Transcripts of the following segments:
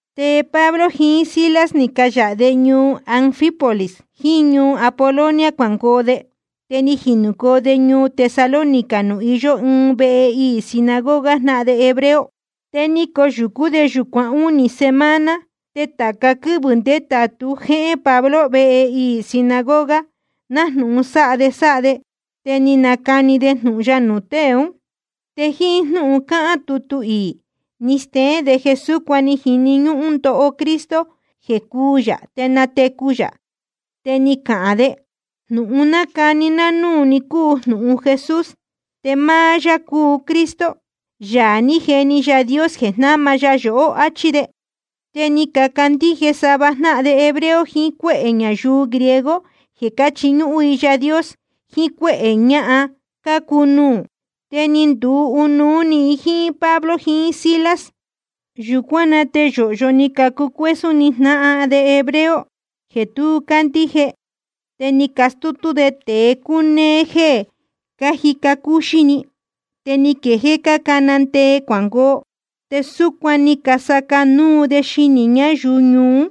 Te Pablo jiín Silas ni cayāha de ñuu Anfípolis jiín ñuu Apolonia cuangoo de, te ni jinūcoo de ñuu Tesalónica nuū iyó ɨɨn vehe iī sinagoga jnáhan de hebreo. Te ni coyūcú de yūcuan únī semana, te tāca quɨ́vɨ̄ ndétātu jéhén Pablo vehe iī sinagoga, nájnūhun sáha sáha de, te ni nacani de jnūhun ya nuū tée un. Te jíín jnúhun cáhán tutu iī ni steén de jeē súcuan ni jini ñúhún ndoho Cristo jeē cúū yā te natecu yā. Te ni cahān de: Jnūhun nácani ná núū ni cúu jnūhun Jesús, te máá yá cúu Cristo, Yaā ní jeni Yaā Dios jeē jnáma ya yohó, áchí de. Te ni cacandíje sava jnáhan de hebreo jiín cuéhē ñayuu griego jeē cáchiñúhún i Yaā Dios, jiín cuéhē ñahan cácuu nuū, te ni nduu ɨnuú ni i jíín Pablo jiín Silas. Yūcuán na te yōhyo ni cacucuésún ni jnáhan de hebreo jeē tu cácandíje, te ni castútú tée cunéé jéē cájica cúxí‑ni, te ni quejéé cácana ndee cuangoo. Te súcuan ni casaca núu de xinī ñáyuu ñuu ún.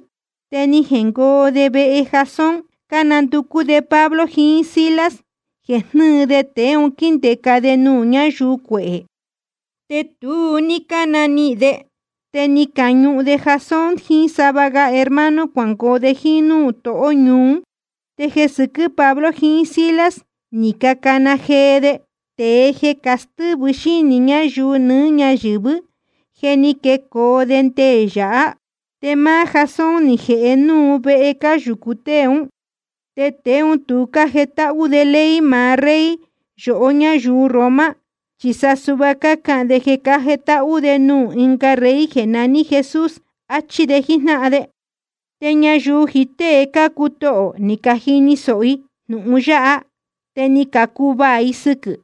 Te ni jengoo de vehe Jasón cánanducú de Pablo jiín Silas jeē jnɨ́ɨ de tēe un quíndēca de nuū ñáyuu cuehē. Te tu ní cánanihīn de, te ni cañuhun de Jasón jiín sava ga hermano cuangoo de jíín núū tohó ñuu ún. Te jeē sɨquɨ́ Pablo jiín Silas ni cacana jee de: Tēe jeē castɨ́vɨ xínī ñáyuu nɨɨ́ ñáyɨ̄vɨ́, je ni quecoo de nde yāhá. Te máá Jasón ni jēhe núu vehe cáyūcu tée ún. Te tēe ún tu cájetáhú de ley maá rey yohó ñáyuu Roma, chi sa suhva cácahān de jeē cájetáhú de nuū ɨnga rey jeē naní Jesús, achí de jíjnáhan de. Te ñayuu jiín tée cácuu tohō ni cajini sōho i jnūhun yáha, te ni cacuvaā i sɨquɨ̄.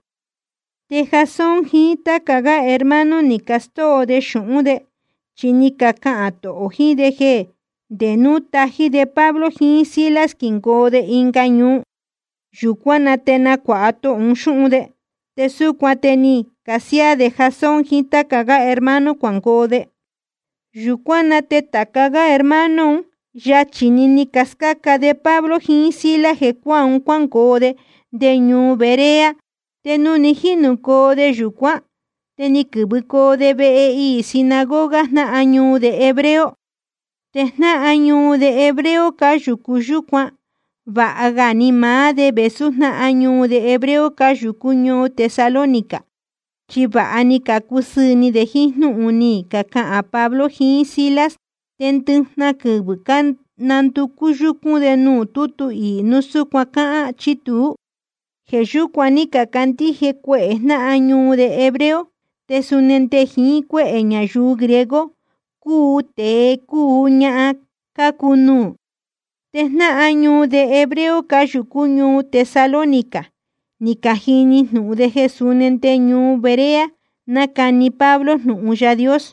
Te Jasón jiín táca gá hermano ni castóo de xūhún de, chi ni cacahān tohō un jíín de jeē nde núu tají de Pablo jiín Silas quingoo de ɨnga ñuu, yūcuán na te nacuāha tohō un xúhun de. Te súcuan te ni casiáá de Jasón jiín táca gá hermano cuangoo de. Yūcuán na te tācá hermano un, yachī‑ni ni cascáca de Pablo jiín Silas jecuáā un, cuángoo de nde ñuu Berea. Te nuū ni jínūcoo de yūcuán, te ni quɨ̄vɨcoo de vehe iī sinagoga jnáhan ñuu de hebreo. Te jnáhan ñuu de hebreo cáyūcu yúcuan, vāha ga ni maá de vēsú jnáhan ñuu de hebreo cáyūcú ñuu Tesalónica, chi vāha ni cacusɨɨ̄ ni de jíín jnúhun ni cacahān Pablo jiín Silas. Te ndɨjnahan quɨvɨ̄ cánanducú yúcún de nuū tútu iī núu súcuan cáhán chí tuú. Jeē yúcuan ní cacandíje cuehē jnáhan ñuu de hebreo te suni nde jiín cuéhē ñayuu griego, cúu tēe cúu ñahan cácuu nuū. Te jnáhan ñuu de hebreo cáyūcú ñuu Tesalónica ni cajini jnūhun de jeē suni nde ñuu Berea nácani Pablo jnūhun Yaā Dios,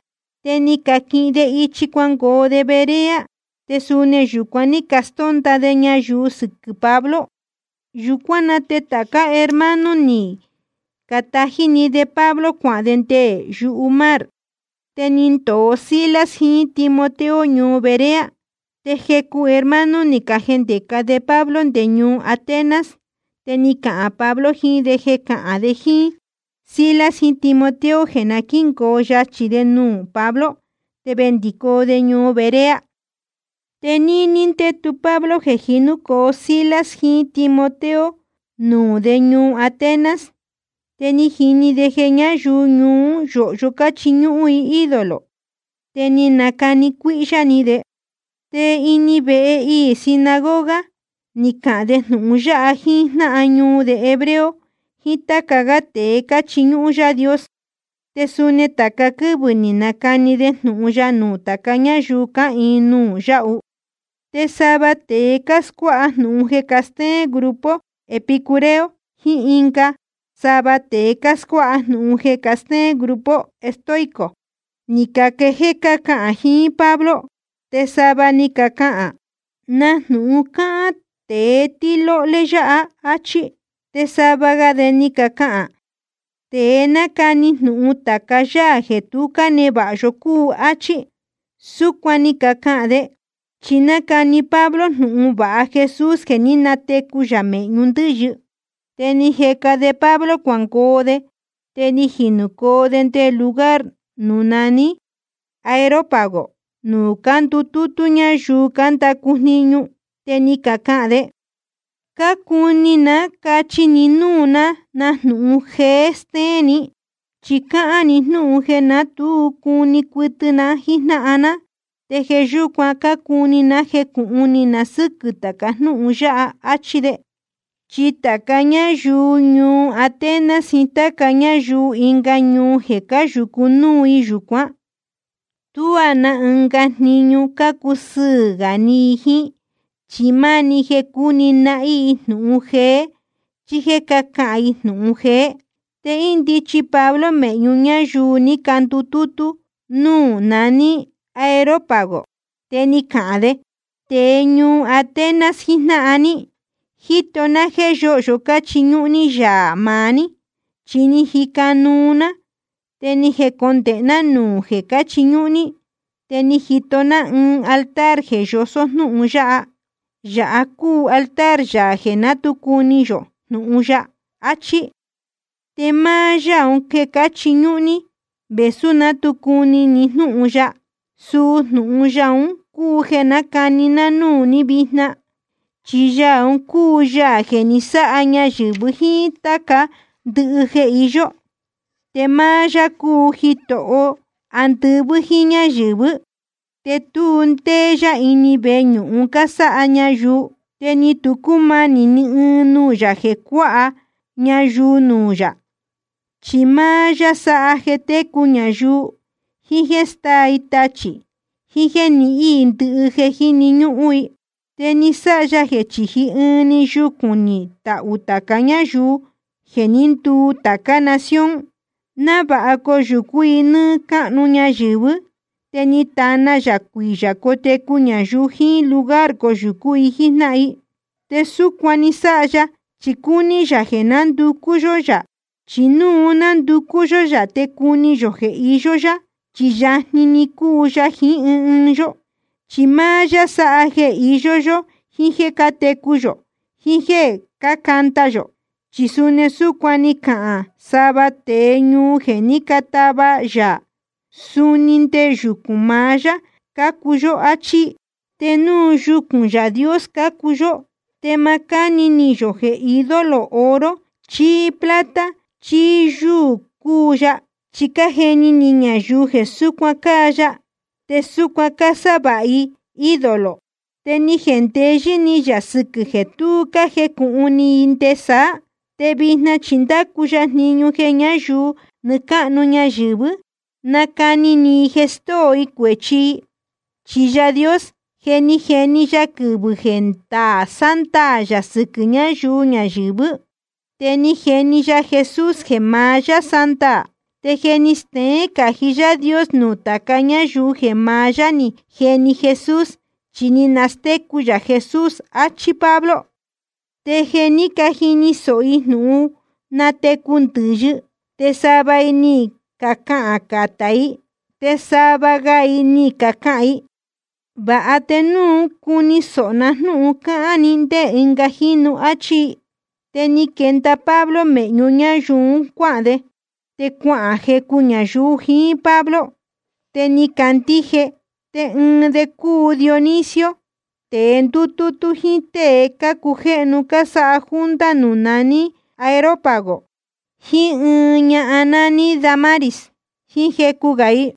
te ni caquihin de ichi cuangoo de Berea, te suni yūcuan ní castónda de ñayuu sɨquɨ̄ Pablo. Yūcuán na te tācá hermano ni catají‑ni de Pablo cuahān de nde yumar. Te ni ndōo Silas jiín Timoteo ñuu Berea. Te jecu hermano ni cajendēca de Pablo nde ñuu Atenas. Te ni cahān Pablo jiín de jeē cahān de jíín Silas jiín Timoteo jeē na quíngoo yachī de nuū Pablo. Te vendicoo de ñuu Berea. Te níní ndétu Pablo jeē jinúcoo Silas jiín Timoteo nuū de ñuu Atenas, te ni jini de jeē ñáyuu ñuu ún yōhyo cáchiñúhún i ídolo, te ni nacani cuíhyá ni de. Te ini vehe iī sinagoga ni cahān de jnūhun ya jiín jnáhan ñuu de hebreo jiín táca gá tēe cáchiñúhún Yáā Dios. Te suni tāca quɨ́vɨ̄ ni nacani de jnūhun ya nuū tāca ñáyuu cáhīin nuū yáhu. Te sava tēe cáscuáha jnūhun jeē castéén grupo epicúreo, jiín ɨnga sava tēe cáscuáha jnūhun jeē castéén grupo estoico, ni caquejéé cácahān jiín Pablo. Te sava ni cacahān: ¿Na jnūhun cáhán tēe tɨ́lóhlé yāha? áchí. Te sava ga de ni cacahān: Tēe nácani jnūhun tāca yáā jeē tu cánevāha yó cúu de, áchí. Súcuan ni cacahān de, chi nácani Pablo jnūhun vāha Jesús jeē ní natecu yā mēhñu ndɨ́yɨ. Te ni cajeca de Pablo cuangoo de, te ni jinūcoo de nde lugar nuū naní Areópago nuū cándutútú ñáyuu cándacu jniñu, te ni cacahān de: Cácuni ná cachi ni núū na jnúhun jeé jéē steén ni. Chi cáhán ni jnúhun jeē ná tu cuni cuɨtɨ na jíjnáhan ná, te jeē yúcuan cácuni ná jecūhun ni na sɨ́quɨ̄ tāca jnúhun yáha, áchí jíín de. Chi tāca ñáyuu ñuu Atenas jiín táca ñáyuu ɨnga ñuu jeē cáyūcu núu i yūcuán, tuá na ɨnga jniñu cácusɨɨ̄ gā ni i jíín chi máá‑ni jeē cuni nahín i jnūhun jeé chí jéē cahán i jnūhun jeé. Te índichi Pablo mēhñu ñáyuu ní candutútú núū naní Areópago, te ni cahān de: Tēe ñuu Atenas jijnáhan ní, jíto ná jéē yóhyo cáchiñúhún ní yaā maá ní. Chi ni jica nuu ná, te ni jecondēhe ná nuū jeē cáchiñúhún ní, te ni jito ná ɨɨn altar jeē yosó jnúhun yáha: Yāha cúu altar yaā jeē ná tu cuni yō jnūhun ya, achí. Te máá Yáā un jéē cáchiñúhún ní, vēsú ná tu cuni ni jnúhun ya, suu jnūhun Yaā un cúu jeē nácani ná núū ní vijna. ’Chi Yaā un cúu Yaā jeē ni sáha ñayɨ̄vɨ jíín táca ndɨhɨ jeē iyó, te máá yá cúu Jitoho andɨvɨ́ jíín ñáyɨ̄vɨ́, te tu ndéé yá ini veñūhun cásáha ñayuu. Te ni tu cúmanī ni ɨɨn nuū yā jeē cuáha ñayuu nuū yā, chi máá yá sáha jeē técu ñayuu, jiín jéē stáa i tachī i, jíín jéē nihín i ndɨhɨ jeē jíni ñúhún i. ’Te ni sáha ya jeē chíji ɨɨn‑ni yucūn ni tahū tāca ñáyuu jeē ní nduu tācá nación, návāha coyūcú i nɨ́ɨ́ cáhnu ñayɨ̄vɨ́, te ni tana yā cuiyā cotecu ñayuu jiín lugar coyūcú i jíjnáhan i. Te súcuan ni sáha ya chi cúní yā jeē nanducú yó yā, chi núu nanducú yó yā te cuni yō jeē iyó yá, chi yajni‑ni cúu ya jiín ɨɨn ɨɨn yó. Chi máá yá sáha jeē iyó yó jiín jéē cátecu yō jiín jéē cácanda yō. Chi suni súcuan ni cacahān sava tēe ñuu ni jéē cátava yaa: Suni nde yucūn maá yá cácuu yó, áchí. Te núu yucūn Yaā Dios cácuu yó, te ma cáni ni yō jeē ídolo oro chí plata chí yúū cúu ya, chi cájeni ni ñayuu jeē súcuan cáa ya, te súcuan cásávāha i ídolo. Te ni jendeyɨ́ ni yā sɨquɨ̄ jeē tu ní cájecūhun ni i nɨ́ɨ́ ndé saá, te vijna chi ndácu ya jniñu jeē ñáyuu nɨɨ́ cáhnu ñayɨ̄vɨ́ na nácani ni i jeē stóo i cuēchi i. Chi Yaā Dios, je ni jeni ya quɨvɨ̄ jeē ndaā sándaā yā sɨquɨ̄ ñayuu ñayɨ̄vɨ́, te ni jeni ya Jesús jeē maá yá sándaā. Te je ni steén cají Yaā Dios nuū tāca ñáyuu jeē maá yá ni jeni Jesús, chi ni nastécu yā Jesús, achí Pablo. Te jeē ní cajini sōho i jnūhun jeē nátecu ndɨ̄yɨ te sava i ni cacahān catá i, te sava ga i ni cacahān i: Vāha te núu cuu cuni sōho na jnúhun cáhán ni ndé ɨnga jínu, áchí i. Te ni quenda Pablo mēhñu ñáyuu un cuáhān de. Te cuahān jecu ñayuu jiín Pablo, te ni cacandíje. Te ɨɨn de cúu Dionisio, tēe ndútútú jíín tée cácujéhnu cásáha junta nuū naní Areópago, jíín ɨɨn ñahan nání Dámaris, jíín jecu gā i.